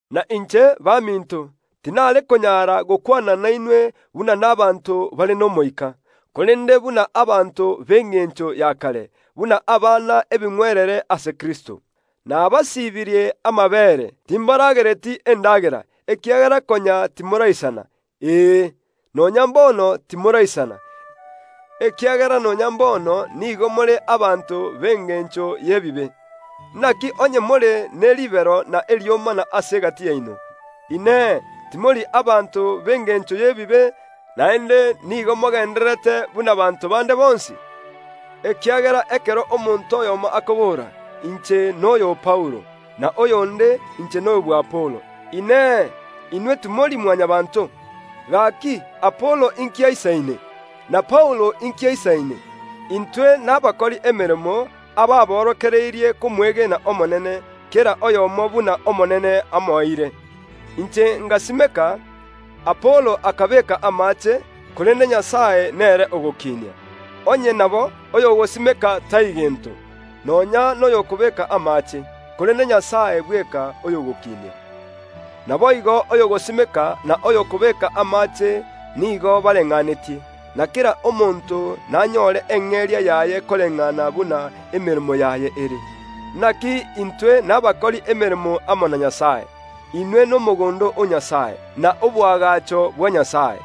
Na inche, baminto, tinare konyara gokwana nainwe buna nabaanto bare n’Omoika, korende buna abanto b’engencho ya kare, buna abana ebing’werere ase Kristo. Nabasiibirie amabeere, timbaragereti endagera; ekiagera konya timoraisana; ee, nonya mbono timoraisana, ekiagera nonya mbono nigo more abanto b’engencho y’ebibe. Naki onye more ne ribero na eriomana ase egati yaino, Inee, timori abanto b’engencho y’ebibe, naende nigo mogendererete buna banto bande bonsi? Ekiagera ekero omonto oyomo akobora, “Inche noyo o Paulo,” na oyonde, “Inche noyo bw’Apolo.” Inee, inwe timori Mwanyabaanto? Gaki Apolo inki aisaine? Na Paulo inki aisaine? Intwe nabakori emeremo, ababorokereirie komwegena Omonene, kera oyomo buna Omonene amoeire. Inche ngasimeka, Apolo akabeeka amaache, korende Nyasae nere ogokinia. Onye nabo, oyogosimeka tai gento, nonya noyokobeeka amaache, korende Nyasae bweka oyogokinia. Naboigo oyogosimeka, na oyokobeeka amaache nigo bareng’anetie; na kera omonto nanyore eng’eria yaye koreng’ana buna emeremo yaye ere. Naki intwe nabakori emeremo amo na Nyasae; inwe nomogondo o Nyasae, na oboagacho bwa Nyasae.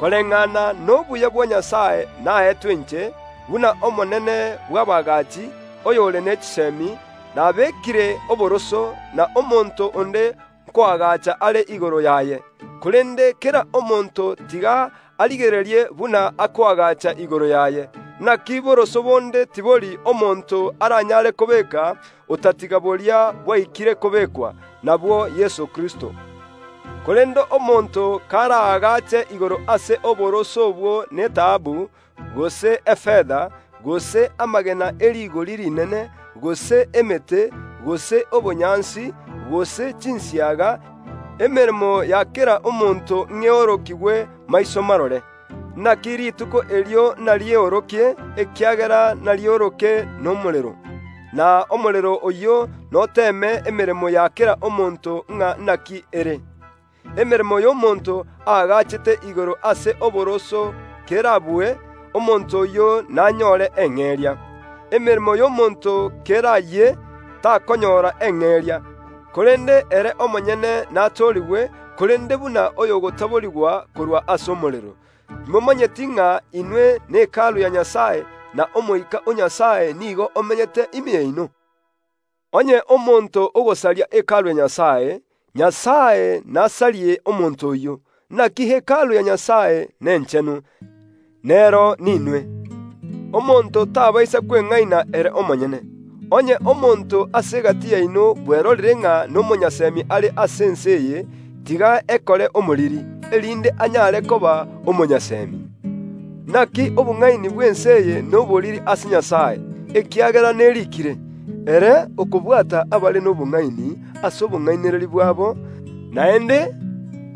Koreng’ana nobuya bwa Nyasae naetwe inche, buna omonene bw’abaagachi, oyore ne chisemi, nabekire oboroso, na omonto onde nkoagacha are igoro yaye. Korende kera omonto tiga arigererie buna akoagacha igoro yaye. Naki boroso bonde tibori omonto aranyare kobeeka, otatiga boria bwaikire kobekwa, nabwo Yeso Kristo. Korende omonto karaagache igoro ase oboroso obwo netaabu, gose efeta, gose amagena e rigori rinene, gose emete, gose obonyansi, gose chinsiaga, emeremo ya kera omonto ing’a eorokigwe maiso marore. Naki Rituko erio inariyeorokie, ekiagera narioroke nomorero; na omorero oyio noteeme emeremo ya kera omonto ng’a naki ere. Emeremo y’omonto aagachete igoro ase oboroso kerabue, omonto oyio nanyore eng’eria. Emeremo y’omonto kerayie, takonyora eng’eria, korende ere omonyene natoorigwe, korende buna oyo ogotaborigwa korwa ase omorero. Timomanyeti ng’a inwe ne Hekalu ya Nyasae, na Omoika o Nyasae nigo amenyete ime yaino? Onye omonto ogosaria Hekalu ya Nyasae, Nyasae nasarie omonto oyio; naki Hekalu ya Nyasae nenchenu, nero ninwe. Omonto tabaisa kweng’aina ere omonyene. Onye omonto ase egati yaino bwerorire ng’a nomonyasemi are ase ense eye, tiga ekore omoriri, erinde anyare koba omonyasemi. Naki obong’aini bw’ense eye noboriri ase Nyasae, ekiagera neriikire, “Nyasae nigo akobwata abare nobong’aini ase obong’ainereria bwabo”, naende,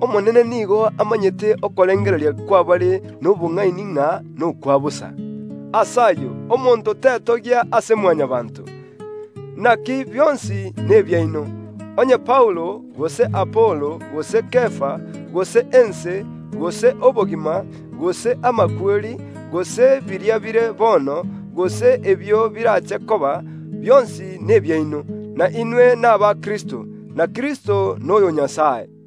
“Omonene nigo amanyete okorengereria kw’abare nobong’aini ng’a nokwa bosa.” Ase ayio omonto tetogia ase Mwanyabaanto. Naki bionsi nebiaino; onye Paulo, gose Apolo, gose Kefa, gose ense, gose obogima, gose amakweri, gose biria bire bono, gose ebio birache koba; bionsi nebiaino; na inwe naba Kristo, na Kristo noyo o Nyasae.